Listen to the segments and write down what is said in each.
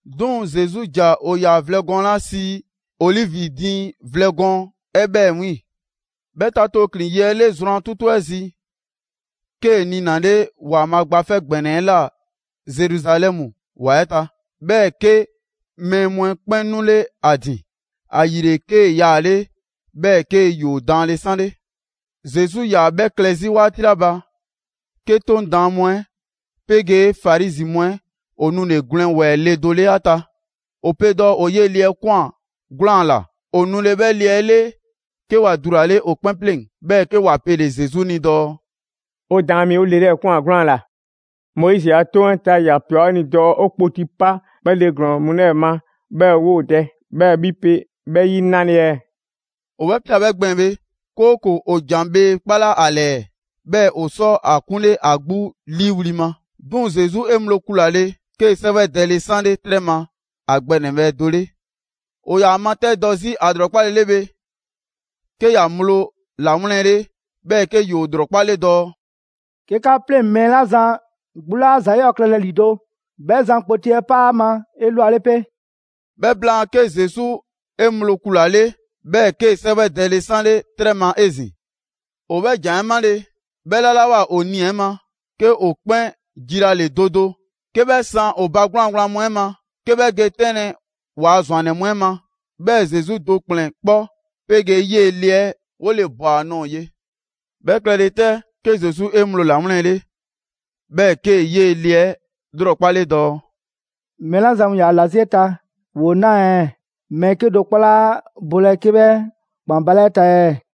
'Duŋ‑ Zesu ‑ja ‑o ‑yaa vlɛ gɔɔn 'la sii ‹Olivi diiŋ vlɛ gɔɔn› 'ɛ 'bhɛ 'wiiŋ‑. 'Bhɛ ta tooklin‑ yi 'ɛ 'le zrwan 'tutu 'ɛ zi, 'kee‑ niinale‑Waanbhaa' Gba 'Fɛ ‑Gbɛnɛ 'ɛ ꞊la Zeruzalɛmu ‑wa 'ɛ ta. 'Bhɛɛ‑ 'ke mɛɛ mu 'ɛ 'kpɛn 'nule ‑a ‑din. ‑Ayile, 'kee‑ yaale' 'bhɛɛ‑ 'ke ‑yoo daanle 'sanle. Zesu 'yaa‑ 'bhɛ klɛ 'zi 'waati 'la ba, 'ke 'Toŋ Daan mu 'ɛ 'pegee Farizi mu 'ɛ ‑o nule‑ gwlɛn ‑wɛɛ le do 'le 'a ta. ‑O pe dɔɔ ‑o 'yee‑ le 'ɛ ꞊kwan 'gwlaan‑ ‑la. ‑O nule 'bhɛ le 'ɛ 'le, 'ke ‑wa dulale ‑o 'kpɛn 'pleŋ‑. 'Bhɛɛ‑ 'ke ‑wa pele‑ Zesu ni dɔɔ: «'O Daan mi, 'o le 'lɛɛ‑ ꞊kwan 'gwlaan‑ ‑la. Moizi a 'Toŋ 'ɛ ta, ‑ya ꞊pia 'o ni dɔɔ 'o kpoti 'pa 'bhɛ le ‑glɔɔn mu 'lɛɛ‑ ma 'bhɛɛ‑ 'woo‑ dɛ, 'bhɛɛ‑ 'bhi pe 'bhɛ 'yi 'nale‑ ɛɛ?» ‑O 'bhɛ 'pia‑ 'bhɛ gbɛɛn‑ bhe, 'kooko‑ ‑o ‑jan bhee kpalaa' ‑a 'lɛɛ, 'bhɛɛ‑ ‑o sɔ ‑a 'kunle ‑a 'gbu 'liiwli‑ ma. 'Duŋ‑ Zesu 'e ŋgblo kulale, 'kee‑ 'sɛwɛdɛle 'sanle 'trɛ ma ‑a gbɛ ‑nɛbhɛ' do 'le. ‑O ‑yaa ‑a matɛdɔ 'zi ‑a ‑lrɔkpale 'le bhe, 'ke ‑ya ŋgblo ‑lawlɛnle, 'bhɛɛ‑ 'ke ‑yoo ‑lrɔkpale dɔɔ: «'Ke 'ka 'pleŋ‑ mɛɛ 'la zan 'gbu laa ‑za 'yɔɔ‑ klɛlɛ ‑lido', 'bhɛ zan kpoti 'ɛ 'pa ‑a ma 'elwale 'pe.» 'Bhɛ blaan, 'ke Zesu 'e ŋgblo kulale, 'bhɛɛ‑ 'kee‑ 'sɛwɛdɛle 'sanle 'trɛ ma 'ezin‑. ‑O 'bhɛ ‑jan 'ɛ 'male‑, ('bhɛ 'lalawoa ‑o nii‑ 'ɛ ma) 'ke ‑o 'kpɛn jilale do do 'ke 'bhɛ san ‑o ba 'gwlaan‑ gblaan mu 'ɛ ma, 'ke 'bhɛ ge 'tɛnlɛ‑ ‑waa' ‑zwannɛ mu 'ɛ ma. 'Bhɛɛ‑ Zesu do ‑kplɛn 'kpɔ 'pegee 'yee‑ le 'ɛ 'wole‑ ꞊bwa ‑a nɔɔ‑ ye. 'Bhɛ klɛlɛ 'tɛ, 'ke Zesu 'e ŋgblo ‑lawlɛnle, 'bhɛɛ‑ 'kee‑ 'yee‑ le 'ɛ 'lrɔkpale dɔɔ: «Mɛɛ 'la zan mu ‑yaa ‑la 'zi 'e ta, ‑woo 'naa ɛɛ? Mɛɛ 'kedo‑ 'kpɔ 'laa bolɛ 'ke 'bhɛ ‑kpan baalɛ 'e ta ɛɛ?»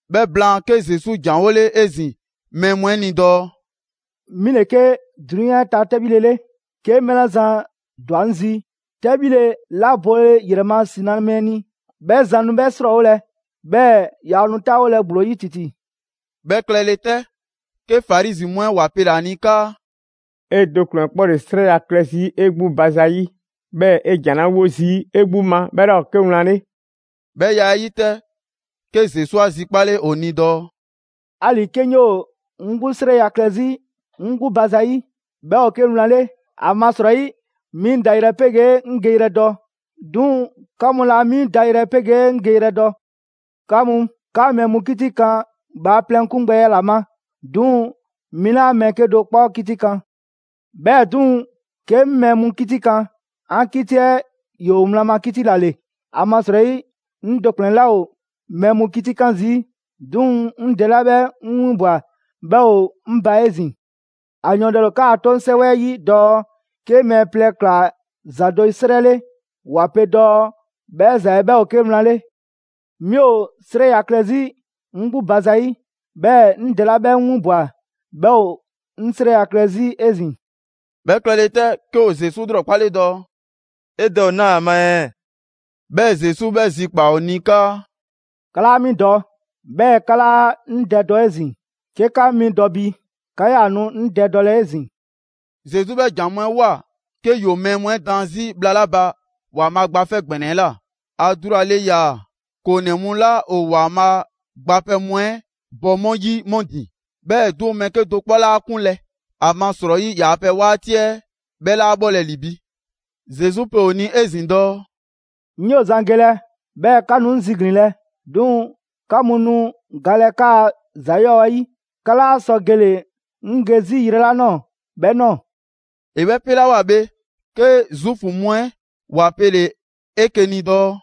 'Bhɛ blaan, 'ke Zesu ‑janwole 'ezin‑ mɛɛ mu 'ɛ 'ni dɔɔ: «'Mi ‑le 'ke 'drunyan 'ɛ ta 'tɛbhile 'le. 'Ke mɛɛ 'la zan ‑dwa 'ŋ zi, 'tɛbhile 'la bole ‑yrɛ ma ‑si na mɛɛ ni 'bhɛ zan nu 'bhɛ 'srɔɔwolɛ, 'bhɛɛ‑ yaa nu 'taawolɛ ‑gblo 'yi ‑titi.» 'Bhɛ klɛle 'tɛ, 'ke Farizi mu 'ɛ ‑wa pele‑ ‑a ni 'kaa: «'E do ‑kplɛn kpɔ ‑le 'srɛya‑ klɛ 'zi 'e 'gbu ba zayi', 'bhɛɛ‑ 'e ‑jan 'la 'wo zii' 'e 'gbu ma, 'bhɛ 'laa ‑o 'ke wlan 'le.» 'Bhɛ ya 'ɛ 'yi 'tɛ, 'ke Zesu 'a zikpale ‑o ni dɔɔ: «'Ali‑ 'ke 'ŋ 'yoo‑ 'ŋ 'gbu 'srɛya‑ klɛ 'zi 'ŋ 'gbu ba zayi', 'bhɛ ‑o 'ke wlan 'le. ‑Amasrɔyi 'mi 'ŋ dayrɛ 'pegee 'ŋ geyrɛ dɔ. 'Duŋ‑ 'ka mu laa 'mi dayrɛ 'pegee 'ŋ geyrɛ dɔ. 'Ka mu, 'ka mɛɛ mu 'kitikan bhaaplɛŋ 'kungbɛya ‑la ma; 'duŋ‑ 'mi 'laa mɛɛ 'kedo‑ 'kpɔ 'kitikan. 'Bhɛɛ‑ 'duŋ‑, 'ke 'ŋ mɛɛ mu 'kitikaan, 'an 'kiti 'ɛ ‑yoo wlan ma 'kiti ‑la ‑le. ‑Amasrɔyi 'ŋ do ‑kplɛn 'laa ‑o mɛɛ mu 'kitikan zii'; 'duŋ‑ 'ŋ Dɛ 'la 'bhɛ 'ŋ 'winbwa‑ 'bhɛ ‑o 'ŋ ba 'ezin‑. ‑A yɔɔndɛle ‑o 'kaa‑ 'toŋ 'sɛwɛ 'ɛ 'yi dɔɔ 'ke mɛɛ plɛ ꞊kla ‑za do 'srɛ 'le, ‑wa pe dɔɔ 'bhɛ ‑za 'ɛ 'bhɛ ‑o 'ke wlan 'le. 'Mi ‑o 'srɛya‑ klɛ 'zi 'ŋ 'gbu ba zayi', 'bhɛɛ‑ 'ŋ Dɛ 'la 'bhɛ 'ŋ 'winbwa‑ 'bhɛ ‑o 'ŋ 'srɛya‑ klɛ 'zi 'ezin‑.» 'Bhɛ klɛle 'tɛ, 'ke ‑o Zesu 'lrɔkpale dɔɔ: «'E Dɛ ‑o 'naa ‑a ma ɛɛ?» 'Bhɛɛ‑ Zesu 'bhɛ zikpaa‑ ‑o ni 'kaa: «'Ka 'laa 'mi dɔ, 'bhɛɛ‑ 'ka 'laa 'ŋ Dɛ dɔ 'ezin‑. 'Ke 'ka 'mi dɔ bi, 'ka 'yaa‑ nu 'ŋ Dɛ dɔlɛ 'ezin‑.» Zesu 'bhɛ ‑jan mu 'ɛ ꞊woa 'ke ‑yoo mɛɛ mu 'ɛ daan 'zi bhla 'la ba ‑Waanbhaa' Gba 'Fɛ ‑Gbɛnɛ 'ɛ ꞊la. ‑A dulale ‑yaa ‑koonɛ mu 'la ‑o ‑Waanbhaa' gbapɛ mu 'ɛ bɔ 'mu 'yi 'mu ‑din. 'Bhɛɛ‑ 'duŋ‑, mɛɛ 'kedo‑ 'kpɔ 'laa ‑a 'kunlɛ‑, ‑amasrɔyi ‑yaa' pɛ 'waati 'ɛ 'bhɛ 'laa bhɔlɛ ‑li bi. Zesu pe ‑o ni 'ezin‑ dɔɔ: «'Ŋ 'yoo‑ zan gelɛ, 'bhɛɛ‑ 'ka nu 'ŋ ziglinlɛ. 'Duŋ‑ 'ka mu nu galɛ 'kaa‑ ‑za 'yɔɔ‑ 'ɛ 'yi. 'Ka 'laa sɔ gele‑ 'ŋ ge 'zi yrɛ 'la ꞊nɔɔ 'bhɛ ꞊nɔɔ.» ‑E 'bhɛ 'pelawoa bhe, 'ke Zuufu mu 'ɛ ‑wa pele‑ 'eke‑ ni dɔɔ: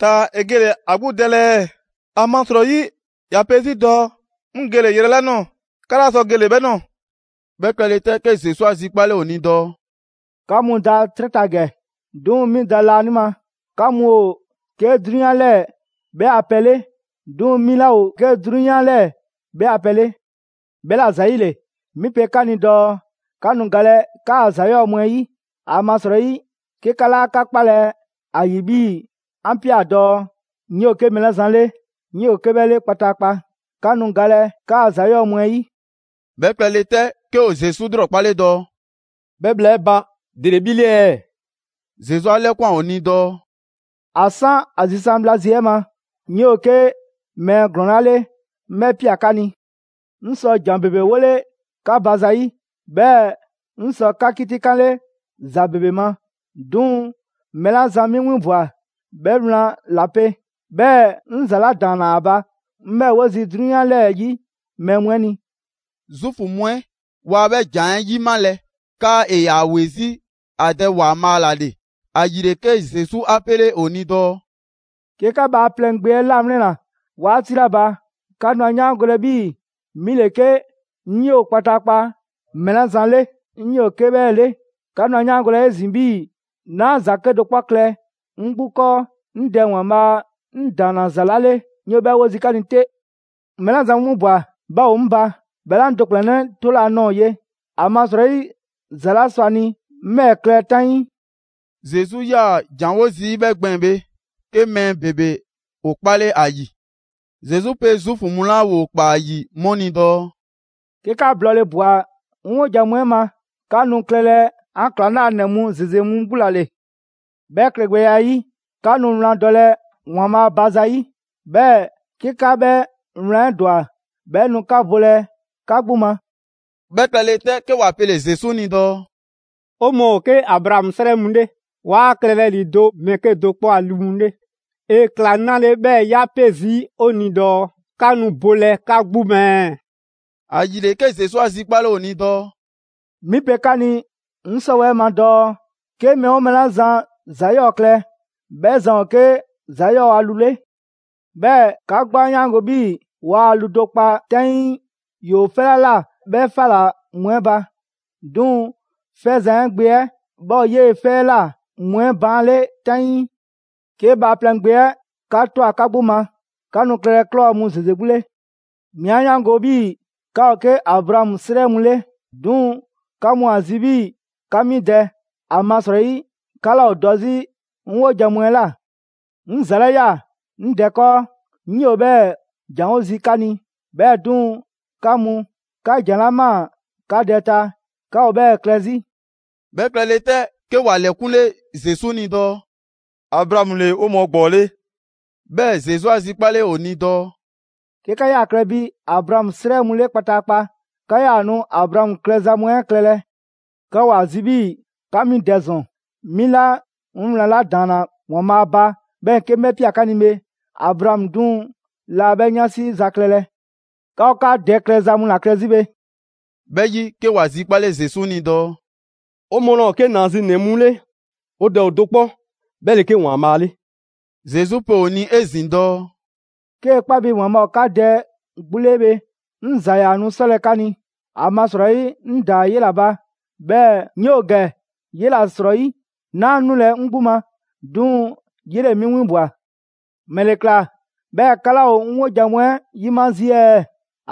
«Taa‑ ‑e gele‑ ‑a 'gbu dɛlɛ ɛɛ? ‑Amasrɔyi ‑ya pe 'zi dɔɔ: ‹'Ŋ gele‑ yrɛ 'la ꞊nɔɔ, 'ka 'laa sɔ gele‑ 'bhɛ ꞊nɔɔ.›» 'Bhɛ klɛle 'tɛ, 'ke Zesu 'a zikpale ‑o ni dɔɔ: «'Ka mu da 'trɛ ta ‑gɛ, 'duŋ‑ 'mi da laanima. 'Ka mu ‑o 'ke 'drunyan 'lɛɛ‑ 'bhɛ a pɛ 'le, 'duŋ‑ 'mi 'laa ‑o 'ke 'drunyan 'lɛɛ‑ 'bhɛ a pɛ 'le. 'Bhɛla‑ ‑zayile, 'mi pe 'ka ni dɔɔ 'ka nu galɛ 'kaa‑ ‑za 'yɔɔ‑ mu 'ɛ 'yi. ‑Amasrɔyi 'ke 'ka 'laa 'ka 'kpalɛ‑ ‑a ‑yi 'bhii‑ 'an ꞊pia dɔɔ: ‹'Ŋ 'yoo‑ 'ke mɛɛ 'la zan 'Ŋ 'yoo 'ke 'bhɛ 'le kpataakpa.› 'Ka nu galɛ 'kaa ‑za 'yɔɔ‑ mu 'ɛ 'yi.» 'Bhɛ klɛle 'tɛ, 'ke ‑o Zesu 'lrɔkpale dɔɔ: «'Bhɛ bhla 'ɛ ba, ‑dele 'bhi 'le ɛɛ?» Zesu 'a 'lɛkwan ‑o ni dɔɔ: «‑A 'san ‑a zisan' bhla zi 'ɛ ma, 'ŋ 'yoo‑ 'ke mɛɛ ‑glɔɔn 'la 'le, 'ŋ 'bhɛ 'pia‑ 'ka ni. 'Ŋ sɔ ‑jan ‑bebe 'wole 'ka ba zayi', 'bhɛɛ‑ 'ŋ sɔ 'ka 'kitikanle ‑za ‑bebe ma. 'Duŋ‑ mɛɛ 'la zan 'mi 'winbwa‑ 'bhɛ wlan ‑la pe, 'bhɛɛ‑ 'ŋ ‑za 'la ‑daanna ‑a ba, 'ŋ 'bhɛɛ‑ 'wo zii' 'drunyan 'lɛɛ‑ 'yi mɛɛ mu 'ɛ ni.» Zuufu mu 'ɛ waa 'bhɛ ‑jan 'ɛ 'yimalɛ 'kaa ‑e ‑yaa ‑we 'zi ‑a Dɛ ‑Waanbhaa' ‑la ‑le. ‑Ayile 'ke Zesu 'a 'pele ‑o ni dɔɔ: «'Ke 'ka Bhaaplɛŋ Gbe 'ɛ 'lawlɛnna 'waati 'la ba, 'ka nu ‑a 'yaangolɛ 'bhii‑ 'mi ‑le 'ke ‹'Ŋ 'yoo‑ kpataakpa mɛɛ 'la zan 'Ŋ 'yoo 'ke 'bhɛɛ‑ 'le›. 'Ka nu 'a 'yaangolɛ 'ezin‑ 'bhii‑ 'naa ‑za 'kedo‑ 'kpɔ klɛ 'ŋ 'gbu 'kɔɔ: 'ŋ Dɛ ‑Waanbhaa' 'ŋ ‑daanna ‑za 'la 'le, 'ŋ 'yoo‑ 'bhɛɛ‑ 'wo zii' 'ka ni 'te. Mɛɛ 'la zan 'ŋ 'winbwa‑ 'bhɛ ‑o 'ŋ ba; 'bhɛ 'laa 'ŋ do ‑kplɛnnɛ' 'tolɛ‑ a nɔɔ‑ 'le, ‑amasrɔyi ‑za 'la sɔ ‑a ni 'ŋ 'bhɛɛ‑ klɛ 'taŋii.» Zesu 'yaa‑ ‑janwo' zii' 'bhɛ gbɛɛn‑ bhe, 'ke mɛɛ ‑bebe ‑o 'kpale 'a ‑yi. Zesu pe Zuufu mu 'la ‑woo ‑kpaa ‑a ‑yi 'mu ni dɔɔ: «'Ke 'ka blɔɔle ꞊bwa 'ŋ 'wojan‑ mu 'ɛ ma, 'ka nu klɛlɛ 'an ‑klaŋlanɛ mu ‑zeze mu 'gbu ‑la ‑le. 'Bhɛ klɛgbɛya 'ɛ 'yi, 'ka nu wlan dɔlɛ ‑Waanbhaa' ba zayi', 'bhɛɛ‑ 'ke 'ka 'bhɛ wlan 'ɛ ‑dwa 'bhɛ nu 'ka bolɛ 'ka 'gbu ma.» 'Bhɛ klɛle 'tɛ, 'ke ‑wa pele‑ Zesu ni dɔɔ: «'O mɔɔ ‑o 'ke Abraamu 'srɛ mu 'le, 'waa klɛlɛ ‑lido' mɛɛ 'kedo‑ 'kpɔ a lu mu 'le. ‑E ‑kla 'nale‑ 'bhɛɛ‑ 'ya 'pe zii' 'o ni dɔɔ: ‹'Ka nu bolɛ 'ka 'gbu ma ɛɛ?›» ‑Ayile 'ke Zesu 'a zikpale ‑o ni dɔɔ: «'Mi pe 'ka ni 'ŋ 'sɔwɛɛ‑ ma dɔɔ 'ke mɛɛ 'oo mɛɛ 'la zan ‑za 'yɔɔ‑ klɛ, 'bhɛ zan ‑o 'ke ‑za 'yɔɔ a lu 'le. 'Bhɛɛ‑ 'ka 'gbu 'a 'yaango‑ 'bhii‑ waa lu do kpa 'taŋii ‑yoo 'fɛ 'la ꞊la 'bhɛ 'fa ‑la mu 'ɛ ba. 'Duŋ‑ 'fɛzan‑ 'ɛ gbe 'ɛ, 'bhɛ ‑o 'yee‑ 'fɛ 'ɛ ꞊la mu 'ɛ baan' 'le 'taŋii. 'Ke Bhaaplɛŋ Gbe 'ɛ 'ka ꞊twa 'ka 'gbu ma, 'ka nu klɛlɛ ꞊klɔ mu ‑zeze 'gbu 'le. 'Mi 'a 'yaango‑ 'bhii‑ 'ka ‑o 'ke Abraamu 'srɛ mu 'le. 'Duŋ‑ 'ka mu ‑a zi' 'bhii‑ 'ka 'mi dɛ, ‑amasrɔyi 'ka 'laa ‑o dɔ 'zi 'ŋ 'wojan‑ mu 'ɛ ꞊la. 'Ŋ ‑za 'la ꞊ya 'ŋ Dɛ 'kɔɔ, 'ŋ 'yoo‑ 'bhɛɛ‑ ‑janwo' zii' 'ka ni. 'Bhɛɛ‑ 'duŋ‑ 'ka mu, 'ka ‑jan 'la ꞊maa 'ka dɛ ta, 'ka ‑o 'bhɛɛ‑ klɛ 'zi.» 'Bhɛ klɛle 'tɛ, 'ke ‑wa ‑lɛkunle Zesu ni dɔɔ: «Abraamu ‑le 'o mɔɔ ‑gbɔɔ 'le.» 'Bhɛɛ‑ Zesu 'a zikpale ‑o ni dɔɔ: «'Ke 'ka 'yaa‑ klɛ bi Abraamu 'srɛ mu 'le kpataakpa, 'ka 'yaa‑ nu Abraamu klɛza mu 'ɛ klɛlɛ. 'Ka ‑o ‑a zi 'bhii‑ 'ka 'mi dɛ ‑zɔn, 'mi 'la 'ŋ wlan 'la ‑daanna ‑Waanbhaa' ba 'bhɛɛ‑ 'ke 'ŋ 'bhɛ ꞊pia 'ka ni bhe. Abraamu 'duŋ‑ laa 'bhɛ 'yansi za klɛlɛ! 'Ka ‑o 'ka dɛ klɛza mu ‑la klɛ 'zi.» 'Bhɛ 'yi, 'ke ‑wa zikpale Zesu ni dɔɔ: «'O mɔɔ laa ‑o 'ke ‑naazinɛ mu 'le, 'o Dɛ ‑o do 'kpɔ, 'bhɛ ‑le 'ke ‑Waanbhaa' 'le.» Zesu pe ‑o ni 'ezin‑ dɔɔ: «'Kee‑ 'kpa bi ‑Waanbhaa' ‑o 'ka Dɛ 'gbu 'le bhe, 'ŋ ‑za ‑yaa nu 'sɔlɛ‑ 'ka ni. ‑Amasrɔyi 'ŋ ꞊daa 'yela‑ ba, 'bhɛɛ‑ 'ŋ 'yoo‑ ‑gɛ 'yela‑ 'srɔyi. 'Naa 'nulɛ‑ 'ŋ 'gbu ma, 'duŋ‑ 'yele‑ 'mi 'winbwa‑. ‑Mɛle ‑kla 'bhɛɛ‑ 'ka 'laa ‑o 'ŋ 'wojan‑ mu 'ɛ 'yima zii' ɛɛ?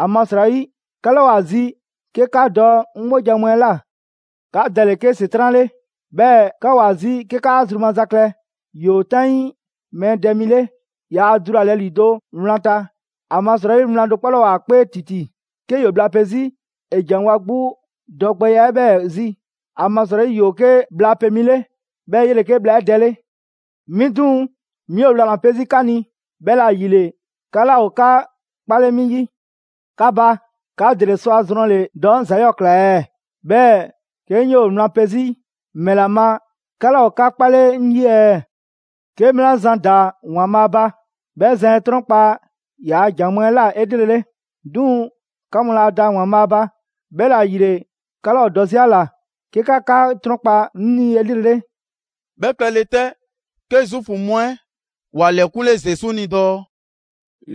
‑Amasrɔyi 'ka 'laa ‑o ‑a zi 'ke 'ka dɔ 'ŋ 'wojan‑ mu 'ɛ ꞊la. 'Ka dɛ ‑le 'ke ‑Setran' 'le, 'bhɛɛ‑ 'ka ‑o ‑a zi 'ke 'kaa zru maza ‑la klɛ. ‑Yoo 'taŋii mɛɛ dɛ mi 'le. Yaa dulalɛ ‑lido' wlan ta, ‑amasrɔyi wlan do 'kpɔ laa ‑o ‑a 'kpee ‑titi. 'Ke ‑yoo bhla pe 'zi, ‑e ‑janwo' ‑a 'gbu dɔgbɛya 'ɛ 'bhɛɛ‑ zi; ‑amasrɔyi ‑yoo 'ke bhla pe mi 'le, 'bhɛɛ‑ 'yele‑ 'ke bhla 'ɛ dɛ 'le. 'Mi 'duŋ‑, 'mi ‑o wlan ‑la 'pe zii' 'ka ni, 'bhɛla‑ ‑yile 'ka 'laa ‑o 'ka 'kpale 'mi 'yi. 'Ka ba, 'ka ‑dele sɔ a zrɔnle‑ dɔɔ 'ŋ ‑za 'yɔɔ ꞊kla ɛɛ? 'Bhɛɛ‑ 'ke 'ŋ 'yoo‑ wlan pe 'zi, ‑mɛla ma 'ka 'laa ‑o 'ka 'kpale 'ŋ 'yi ɛɛ? 'Ke mɛɛ 'la zan da ‑Waanbhaa' ba, 'bhɛ zan 'e 'trɔnkpa‑ ‑yaa' ‑jan mu 'ɛ ꞊la 'elrele. 'Duŋ‑ 'ka mu laa da ‑Waanbhaa' ba, 'bhɛla‑ ‑yile 'ka 'laa ‑o dɔ 'zi ‑a ‑la 'ke 'ka 'ka 'trɔnkpa 'ŋ ni 'elrele.» 'Bhɛ klɛle 'tɛ, 'ke Zuufu mu 'ɛ ‑wa ‑lɛkunle Zesu ni dɔɔ: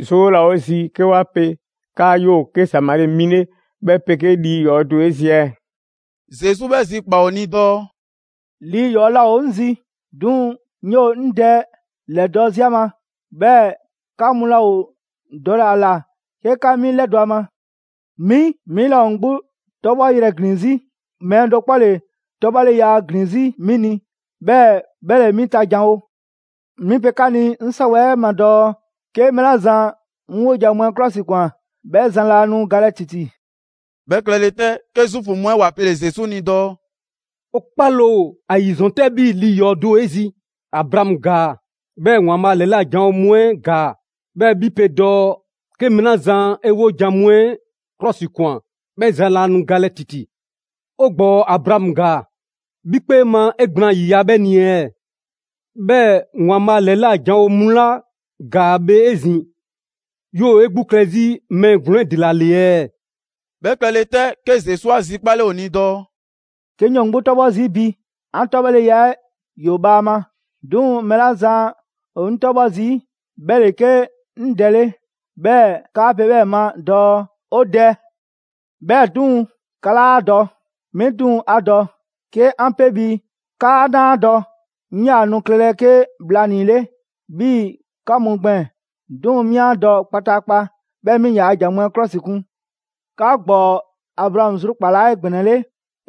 «'Zoo 'laa ‑o 'o zi 'ke 'wa pe 'kaa 'yoo‑ 'ke Samari mi 'le, 'bhɛ 'pegee lii ‑yɔɔ do ‑o 'e zi ɛɛ?» Zesu 'bhɛ zikpaa‑ ‑o ni dɔɔ: «Lii ‑yɔɔ laa ‑o 'ŋ zi. 'Duŋ‑ 'ŋ 'yoo‑ 'ŋ Dɛ ‑lɛdɔ' 'zi ‑a ma, 'bhɛɛ‑ 'ka mu laa ‑o dɔle‑ ‑a ‑la 'ke 'ka 'mi 'lɛdɔ‑ ‑a ma. 'Mi, 'mi 'laa ‑o 'ŋ 'gbu 'tɔbhɔyrɛ ‑glin 'zi. Mɛɛ do 'kpɔ ‑le 'tɔbhɔleya ‑glin 'zi 'mi ni, 'bhɛɛ‑ 'bhɛ ‑le 'mi ta janwo. 'Mi pe 'ka ni 'ŋ 'sɔwɛɛ‑ ma dɔɔ: 'ke mɛɛ 'la zan 'ŋ 'wojan‑ mu 'ɛ 'klɔsikwan 'bhɛ zan laa nu galɛ ‑titi.» 'Bhɛ klɛle 'tɛ, 'ke Zuufu mu 'ɛ ‑wa pele‑ Zesu ni dɔɔ: «'O 'kpale ‑o ‑a ‑yi ‑zɔn 'tɛ 'bhii‑ lii ‑yɔɔ' do ‑o 'e zi! Abraamu ‑gaa, 'bhɛɛ‑ ‑Waanbhaa' ‑lɛla' janwo mu 'ɛ ‑gaa, 'bhɛɛ‑ 'mi pe dɔɔ: ‹'Ke mɛɛ 'la zan 'e 'wojan‑ mu 'ɛ 'klɔsikwan, 'bhɛ zan laa nu galɛ ‑titi.› 'O ‑gbɔɔ Abraamu ‑gaa, 'bhi 'kpee ma 'e gblaan ‑yiya' 'bhɛ ni ɛɛ? 'Bhɛɛ‑ ‑Waanbhaa' ‑lɛla' janwo mu 'la ‑gaa bhe 'ezin‑, 'yoo‑ 'e 'gbu klɛ 'zi mɛɛ ‑glɔɔn 'ɛ ‑dela ‑le ɛɛ?» 'Bhɛ klɛle 'tɛ, 'ke Zesu 'a zikpale ‑o ni dɔɔ: «'Ke 'ŋ 'yoo‑ 'ŋ 'gbu 'tɔbhɔ zii' bi, 'an 'tɔbhɔleya 'ɛ ‑yoo bhaama. 'Duŋ‑ mɛɛ 'la zan ‑o 'ŋ 'tɔbhɔ zii', 'bhɛ ‑le 'ke 'ŋ Dɛ 'le, 'bhɛɛ‑ 'kaa pe 'bhɛɛ‑ ma dɔɔ: 'O Dɛ! 'Bhɛɛ‑ 'duŋ‑, 'ka 'laa ‑a dɔ. 'Mi 'duŋ‑ 'a dɔ. 'Ke 'an 'pe bi 'kaa 'naa ‑a dɔ, 'ŋ 'yaa‑ nu klɛlɛ 'ke bhlanii‑ 'le 'bhii‑ 'ka mu gbɛɛn‑. 'Duŋ‑ 'mi 'a dɔ kpataakpa, 'bhɛɛ‑ 'mi ‑yaa ‑jan mu 'ɛ 'klɔsikun. 'Ka ‑gbɔɔ Abraamu zrukpalaa 'egbɛnɛle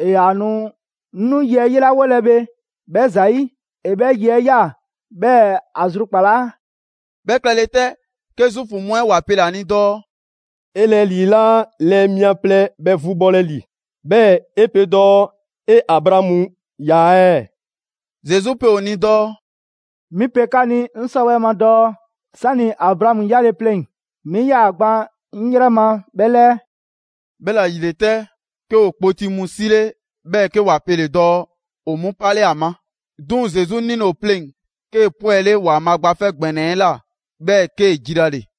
‑e ‑yaa nu 'ŋ 'nu yi 'ɛ 'yelawolɛ bhe 'bhɛ ‑zayi'; ‑e 'bhɛ yi 'ɛ ꞊ya 'bhɛɛ‑ ‑a zrukpalaa.» 'Bhɛ klɛle 'tɛ, 'ke Zuufu mu 'ɛ ‑wa pele‑ ‑a ni dɔɔ: «'E lɛɛ ‑lii 'laa lɛɛ mia plɛ bhɛ vu bhɔlɛ ‑li, 'bhɛɛ‑ 'e pe dɔɔ 'e Abraamu ꞊ya ɛɛ?» Zesu pe ‑o ni dɔɔ: «'Mi pe 'ka ni 'ŋ 'sɔwɛɛ‑ ma dɔɔ 'sani‑ Abraamu 'yale‑ pleŋ‑, 'mi 'yaa‑ gban 'ŋ 'yrɛ ma 'bhɛ 'lɛɛ.» 'Bhɛla‑ ‑yile 'tɛ, 'ke ‑o kpoti mu 'sile, 'bhɛɛ‑ 'ke ‑wa pele‑ dɔɔ ‑o 'mu 'pale 'a ma. 'Duŋ‑ Zesu 'nile‑ ‑o pleŋ‑, 'kee‑ 'pwɛle ‑Waanbhaa' Gba 'Fɛ ‑Gbɛnɛ 'ɛ ꞊la, 'bhɛɛ‑ 'kee‑ jilale.